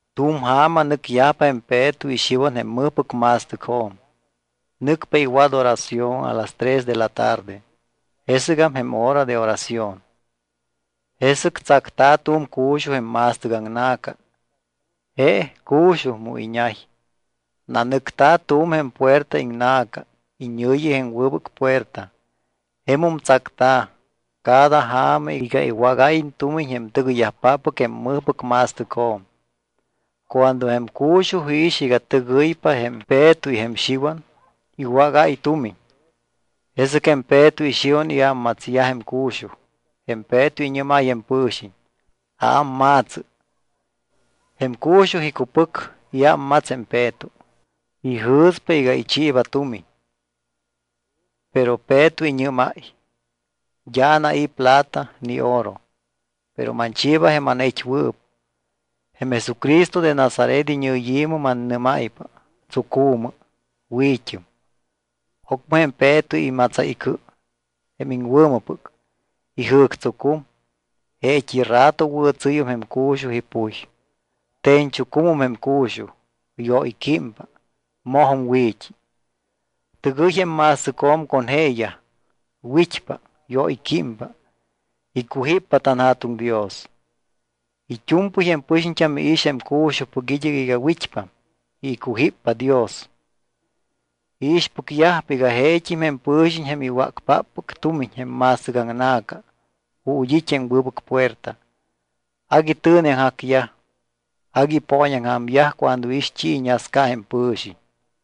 Tu̱m ja̱ma nɨcyajpa jém Peto y Xiwan jém mɨjpɨc ma̱stɨcjo̱m. Nɨcpa iwat oración a las tres de la tarde, jesɨgam jém hora de oración. Jesɨc tsacta̱ tu̱m cu̱xuj jém ma̱stɨc aŋna̱ca. Je cu̱xuj mu iñay. Nanɨcta̱ tu̱m jém puerta iŋna̱ca iñɨ̱yi jém Wɨbɨc Puerta. Jemum tsacta̱ cada ja̱ma iga iwágáyiñ tumiñ jém tɨgɨyyajpáppɨc jém mɨjpɨc ma̱stɨcjo̱m. Cuando jém cu̱xuj iix iga tɨgɨypa jém Peto y jém Xiwan, iwágáy tumiñ. Jesɨc jém Peto y Xiwan iámmatsyaj jém cu̱xuj. Jém Peto iñɨ́máy jém pɨ̱xiñ: —Aámma̱tsɨ. Jém cu̱xuj icupɨc, iámmats jém Peto. Ijɨ̱spa iga ichiiba tumiñ. Pero Peto iñɨ́máy: —D́a anai̱ plata ni oro, pero manchiiba jém anait́wɨɨp. Jém Jesucristo de Nazaret iñɨyi̱mɨ mannɨ́máypa: Tsucu̱mɨ. Wi̱t́ɨm. Ocmɨ jém Peto imatsáy icɨ, jém iŋwɨ̱mɨpɨc, ijɨ̱ctsucum. Jeet́i rato wɨ̱tsɨ́yum jém cu̱xuj ipuy. Te̱ñchucumum jém cu̱xuj, yóyquímpa, mojum wi̱t́i. Tɨgɨy jém ma̱stɨcjo̱m con jeeyaj. Wit́pa, yóyquímpa, icujíppa tanJa̱tuŋ Dios. It́u̱mpɨy jém pɨxiñt́am iix jém cu̱xujpɨc id́ɨc iga wit́pam y icujíppa Dios. Iixpɨcyajpa iga jeet́im jém pɨ̱xiñ jém iwácpáppɨc tumiñ jém ma̱stɨcaŋna̱ca ju̱t́ it́ jém Wɨbɨc Puerta. Agui tɨ̱neaŋjacyaj, agui ipooñaŋja̱myaj cuando iix t́i iñasca jém pɨ̱xiñ.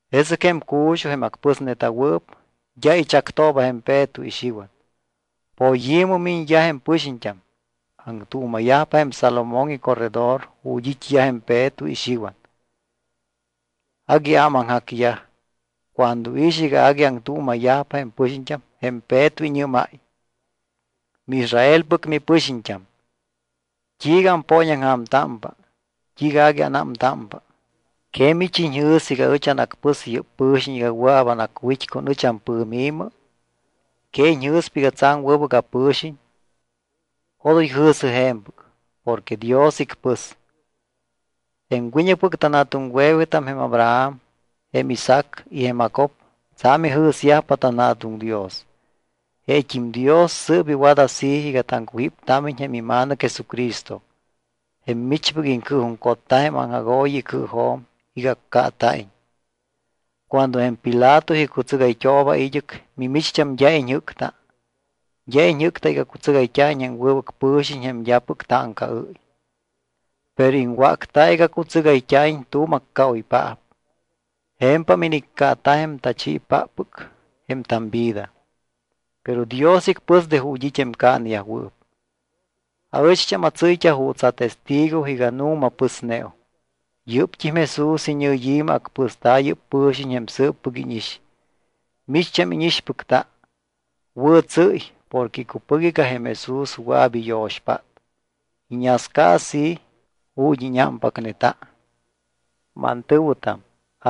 Jesɨc jém cu̱xuj, jém acpɨsneta̱wɨɨp, d́a ichactooba jém Peto y Xiwan. Poyi̱mɨ miñyaj jém pɨxiñt́am, aŋtuuma̱yajpa jém Salomón icorredor ju̱t́ it́yaj jém Peto y Xiwan. Agui ámaŋjacyaj. Cuando iix iga agui aŋtuuma̱yajpa jém pɨxiñt́am jém Peto iñɨ́máy: —MiIsraelpɨc mipɨxiñt́am, ¿t́iiga ampooñaŋja̱mtámpa, t́iiga agui anámtámpa? ¿Que mich iñjɨ̱s iga ɨch anacpɨs yɨ́p pɨ̱xiñ iga wɨa̱p anacwit́ con ɨch ampɨ̱mi? ¿Que iñjɨ̱spa iga tsa̱m wɨbɨc apɨ̱xiñ? Odoy jɨ̱sɨ je̱mpɨc. Porque Dios icpɨs. Jém wiñɨcpɨc tanja̱tuŋwe̱wetam jém Abraham, jém Isaac y jém Jacob tsa̱m ijɨ̱syajpa tanJa̱tuŋ Dios. Jeet́im Dios sɨɨp iwat así iga taŋcujíptámiñ jém iMa̱nɨc Jesucristo, jém michpɨc iŋcɨɨjuŋcotta jém aŋjagooyi icɨɨjo̱m iga accaata̱iñ. Cuando jém Pilato icutsɨgayt́ooba id́ɨc, mimicht́am d́a iñjɨ́cta. D́a iñjɨ́cta iga cutsɨgayt́a̱iñ jém wɨbɨc pɨ̱xiñ jém d́apɨc táŋcaɨ́y. Pero iŋwácta iga cutsɨgayt́a̱iñ tu̱m accaoypaap. Je̱mpam iniccaata jém tachiipáppɨc jém tamvida. Pero Dios icpɨs de ju̱t́ it́ jém caaneyajwɨɨp. Aɨcht́am atsɨ́yt́a juuts atestigo iga nu̱ma pɨsneum. Yɨ́pt́im Jesús iñɨyi̱mɨ acpɨsta̱ yɨ́p pɨ̱xiñ jém sɨɨppɨc íñix, micht́am íñixpɨcta. Wɨ̱tsɨ́y porque icupɨc iga jém Jesús wɨa̱p iyo̱xpát. Iñasca así ju̱t́ íñámpacneta. ’Mantɨ̱wɨtam,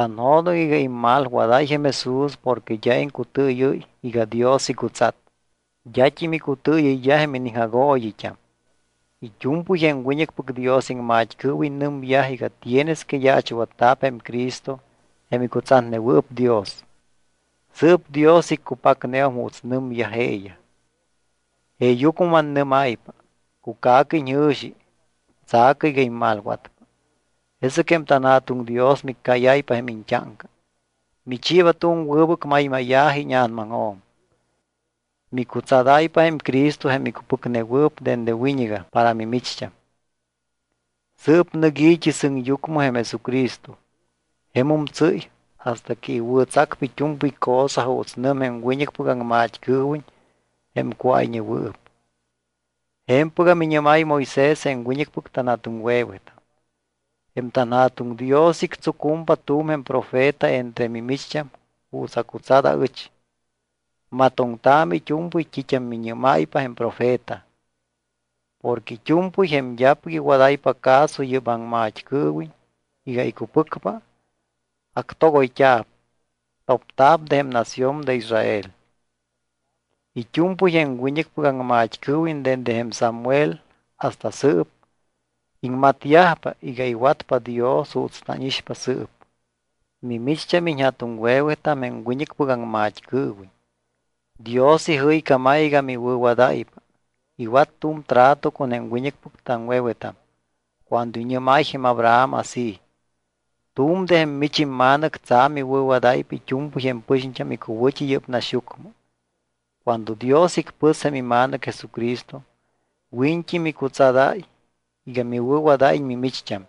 anjo̱doŋ iga immalwadáy jém Jesús porque d́a iŋcutɨɨyɨ́y iga Dios icutsat. D́at́im icutɨɨyɨyyaj jém iniŋjagooyit́am. It́u̱mpɨy jém wiñɨcpɨc Dios iŋmat́cɨɨwiñ nɨmyaj iga tienes que yaachwatta̱p jém Cristo jém icutsatnewɨɨp Dios. Sɨɨp Dios iccupacneum juuts nɨmyaj jeeyaj. Jeeyucmɨ mannɨ́máypa: Cuca̱cɨ iñjɨ̱xi, tsa̱cɨ iga immalwatpa, jesɨc jém tanJa̱tuŋ Dios miccáyáypa jém iñt́áŋca. Michiiba tu̱m wɨbɨc maymáya̱ji íña̱namaŋjo̱m, micutsadáypa jém Cristo jém icupiŋnewɨɨp dende wiñɨgam para mimicht́am. Sɨɨp nɨc i̱t́i sɨŋyucmɨ jém Jesucristo. Jemum tsɨ́y hasta que iwɨ̱tsacpa it́u̱mpɨy cosa juuts nɨm jém wiñɨcpɨc aŋmat́cɨɨwiñ jém cuáyñewɨɨp. Je̱mpɨgam iñɨ́máy Moisés jém wiñɨcpɨc tanja̱tuŋwe̱wetam: “Jém tanJa̱tuŋ Dios ictsucumpa tu̱m jém profeta entre mimicht́am juuts acutsat aɨch. Matoŋtaamɨ it́u̱mpɨy t́it́am miñɨ́máypa jém profeta. Porque it́u̱mpɨy jém d́apɨc iwadáypa caso yɨ́p aŋmat́cɨɨwiñ iga icupɨcpa, actogoyt́a̱p, topta̱p de jém nación de Israel.” ’It́u̱mpɨy jém wiñɨcpɨc aŋmat́cɨɨwiñ dende jém Samuel hasta sɨɨp, iŋmatyajpa iga iwatpa Dios juuts tánixpa sɨɨp. Mimicht́am iñja̱tuŋwe̱wetam jém wiñɨcpɨc aŋmat́cɨɨwiñ. Dios ijɨycámáy iga miwɨ̱wadáypa. Iwat tu̱m trato con jém wiñɨcpɨc taŋwe̱wetam cuando iñɨ́máy jém Abraham así: “Tu̱m jém mich imma̱nɨc tsa̱m iwɨ̱wadáypa it́u̱mpɨy jém pɨxiñt́am icuwɨ̱t́i yɨ́p naxyucmɨ.” Cuando Dios icpɨs jém iMa̱nɨc Jesucristo, wiñt́i micutsadáy iga miwɨ̱wadáyiñ mimicht́am.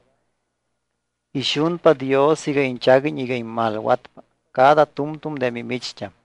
Ixunpa Dios iga iñchaguiñ iga immalwatpa cada tu̱mtu̱m de mimicht́am.